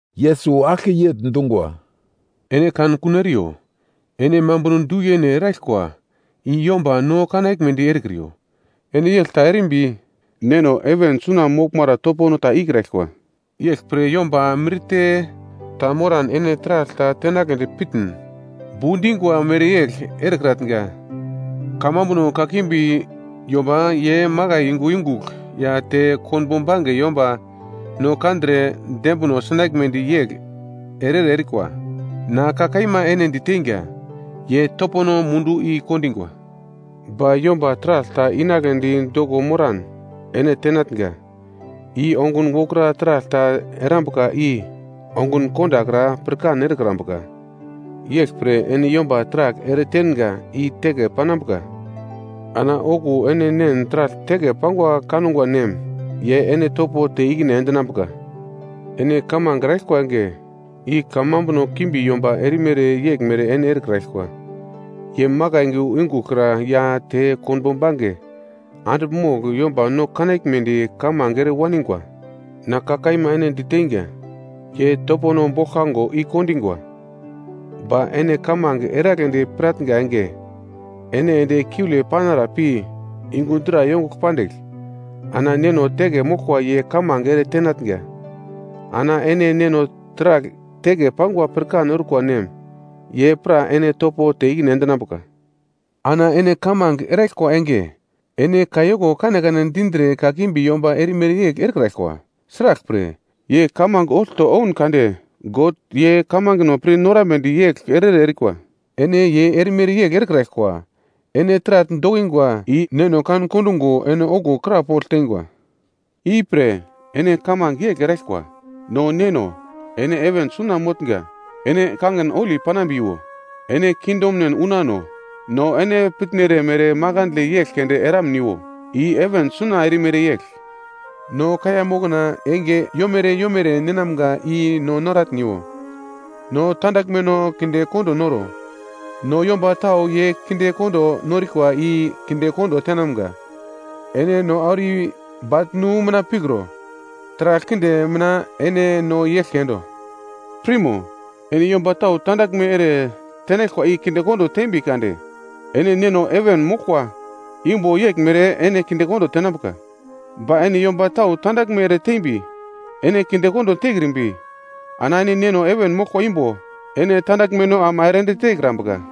Yesus aglke yegl dungwa, “Ene kan kuno eriyo! Ene mambuno du yene eraglkwa i yomba no kanaglmedi erekriyo. Ene yegl ta erimbi, Neno heven suna moglmara topono ta ikraglkwa. “Yeglpre yomba mirte ta moran ene taragl ta tenagledi pirmin, bu dingwa mereyegl erekratnga. Kamambuno kakimbi yomba ye makai yungu yungugl ya te konbo bange yomba no kandre dembino sinaglmedi yegl ere-ere erikwa. Na ka kaima ene diteinga, ye topono mundu i-kondingwa. Ba yomba taragl ta inagledi doko moran ene tenatnga, i ongun wokra taragl ta erambuka i ongun kondakra pirkan erekrambuka. Yeglpre ene yomba taragl eretenga i teke panambuka. Ana okuwo ene Nen taragl teke pangwa kangwa nem, ye ene topo te ikine endinambuka. “Ene kamange eraglkwa enge, i kamambuno kimbi yomba erimere yeglmere ene erekraglkwa. Ye makai yungu yungugl kra ya te konbo bange andigl mogl, yomba no kanaglmedi kamange ere waningwa. Na ka kaima ene diteinga, ye topono boglkango igo kondungwa. Ba ene kamange eragledi piratnga enge, ene ende kiule panara pi yungu dra yongugl pandigl ana Neno teke moglkwa ye kamange ere tenatnga. Ana ene Neno taragl teke pangwa pirkan orkwa nem, ye pra ene topo te ikine endinambuka. Ana ene kamange eraglkwa enge, ene kayoko kanekane dindre kakimbi yomba erimere yegl erekraglkwa, sraglpre, ye kamange olto ouno kade God ye kamangeno pir norambedi yegl ere-ere erikwa. Ene ye erimere yegl erekraglkwa. Ene taragl dokingwa i Neno kan kondungo ene okuwo krapogl teingwa: “Ipre ene kamange yegl eraglkwa: “‘No Neno ene heven suna motnga, ene kangin holi panambiwo. Ene kingdomnen unano. No ene pitnere mere makandle yegl keunde eramniwo, i heven suna erimere yegl. No kaiya mokna enge yomere yomere ninamga i noratniwo. No tandaglmeno kinde kondo noro, no yomba tau ye kinde ere norikwa i kindekondo tenamga. Ene no auro i baglnu mina pikro. Taragl kinde mina ene no i-eglke endo.’ Pirmo! Ene yomba tau tandaglme ere tenaglkwa i kindekondo tembi kade, ene Neno heven moglkwa imbo yeglmere ene kindekondo tenambuka. Ba ene yomba tau tandaglme ere tembi, ene kindekondo tekrimbi, ana ene Neno heven moglkwa imbo ene tandaglmeno ama ere ende tekrambuka.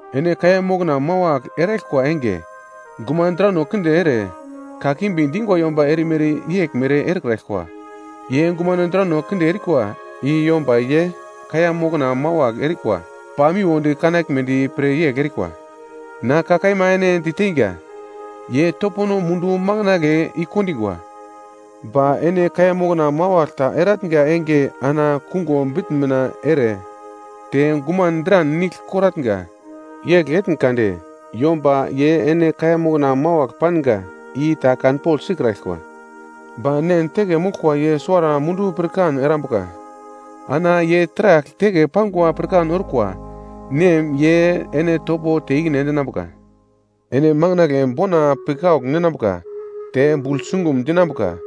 “Ene kaiya mokna mawagl eraglkwa enge, gumano drano kinde ere, kakimbi dingwa yomba erimere yeglmere erekraglkwa. Ye gumano drano kinde erikwa i yomba ye kaiya mokna mawagl erikwa pamiwodi kanaglmedi pre yegl erikwa. Na kaima ene diteinga, ye topono mundu makandle i-kondingwa. Ba ene kaiya mokna mawagl ta eratnga enge ana kungo bitn mina ere, te guman dran nigl koratnga. Yegl etn kade yomba ye ene kaiya mokna mawagl panga i ta kanpogl sikraglkwa, ba Nen teke moglkwa ye suwara mundu pirkan erambuka. Ana ye taragl teke pangwa pirkan orkwa Nem ye ene topo te ikine endinambuka. “Ene makandle bona pikaugl ninambuka te bugl sungum dinambuka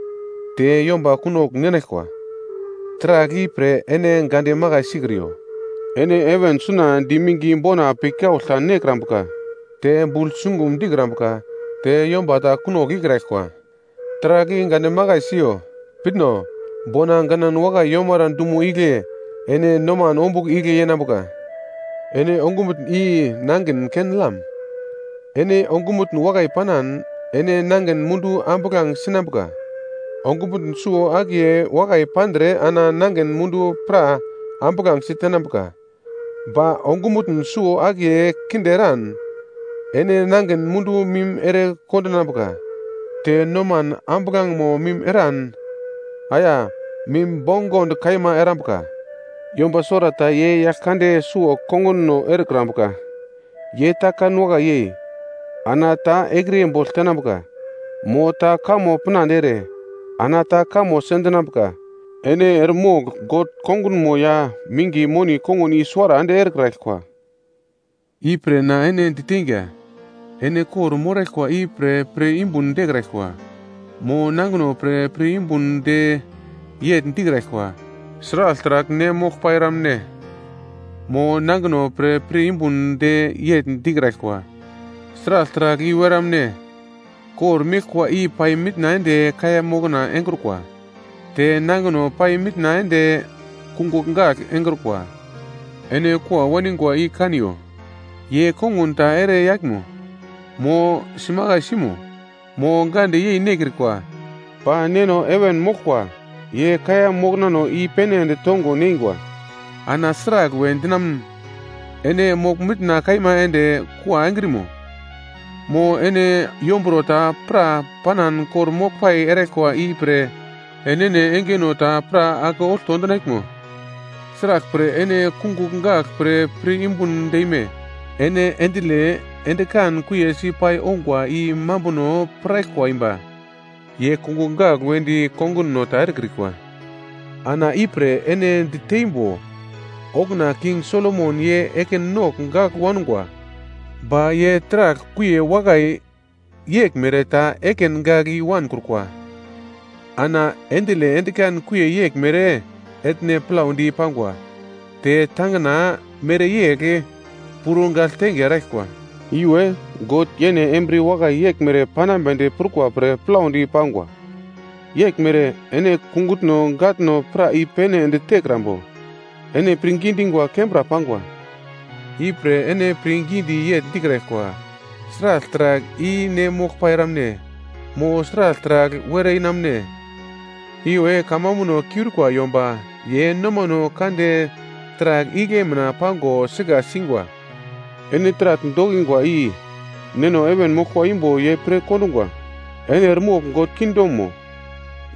te yomba kunogl ninaglkwa, taragl i pre ene gande makai sikriyo. Ene heven suna di minge bona pikaugl ta nekrambuka te bugl sungum dikrambuka te yomba ta kunogl ikraglkwa, taragl i gande makai siyo. Pitno! Bona ganan wakai yomara dumo igle ene nomano ombugl igle yenambuka. “Ene ongumutn i nangin ken-lam. Ene ongumutn wakai panan, ene nangin mundu ambuglange sinambuka. Ongumutn suwo-akiye wakai pandre ana nangin mundu pra ambuglangesi tenambuka. Ba ongumutn suwo-akiye kinde eran, ene nangin mundu mim ere kondinambuka. Te noman ambuglangemo mim eran, aya, mim bongond kaima erambuka. “Yomba suwarata ye yagl kande suwo konguno erekrambuka, ye ta kan wakai yei, ana ta ekriye bogl tenambuka. Mo ta kamo pinande ere ana ta kamo sendinambuka. Ene eremogl God kongunmo ya minge moni kongun i-suwara ende erekraglkwa. “Ipre na ene diteinga, ene kor-moraglkwa i pre pir yumbun dekraglkwa. Mo nangino pre pir yumbun de yegl dikraglkwa. Sragl taragl ne moglpai eramne? Mo nangino pre pir yumbun de yegl dikraglkwa. Sragl taragl i-were wanamne? Kor meglkwa i pai mitna ende kaiya mokna engrukwa, te nangino pai mitna ende kungugl gagl engrukwa. Ene kua waningwa i kaniyo, ye kongun ta ere yaglmo, mo simakaisimo, mo gande yei nekrikwa, ba Neno heven moglkwa ye kaiya moknano i-pene ende tongo neingwa. Ana sragl we dinamun, ene mogl mitna kaima ende kua engrekrimo? Mo ene yomburo ta pra panan kor-moglpai eraglkwa i pre enene engeno ta pra ake olto endinaglmo? “Sraglpre ene kungugl gagl pre pir yumbun deime? Ene akindile endikan kuiye si pai ongwa, i mambunono piraglkwa imba. Ye kungugl gagl wedi konguno ta erekrikwa. Ana ipre ene diteimbo. Okuna King Solomon ye ekin nogl gagl wangwa, ba ye taragl kuiye wakai yeglmere ta ekin gagl i-wankrukwa. Ana akindile endikan kuiye yeglmere, etne plaudi pangwa, te tangina mereyegl puro gagltenge eraglkwa, iwe God yene embriye wakai yeglmere panambedi prukwa pre plaudi pangwa. Yeglmere ene kungutno gatno pra i-pene ende tekrambo? Ene pirngi dingwa kembra pangwa. Ipre ene pirngidi yegl dikraglkwa, ‘Sragl taragl i-ne moglpai eramne, mo sragl taragl were i-wanamune?’ Iwe kamambuno kiurikwa yomba ye nomano kande taragl igle mina pago sika singwa. Ene taragl dokingwa i, Neno heven moglkwa imbo ye pir kondungwa. Ene eremogl God kingdomo,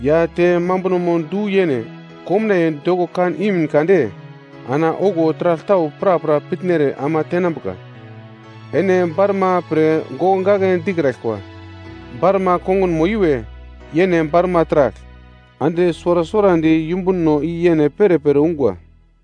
ya te mambunomo du-yene komnaiye doko kan imin kade ana okuwo taragl tau prapra pitnere ama tenambuka. Ene barma pre gokgake dikraglkwa. Barma kongunmo iwe, yene barma taragl. Ande suwara suwarandi yumbuno i yene perepere ungwa.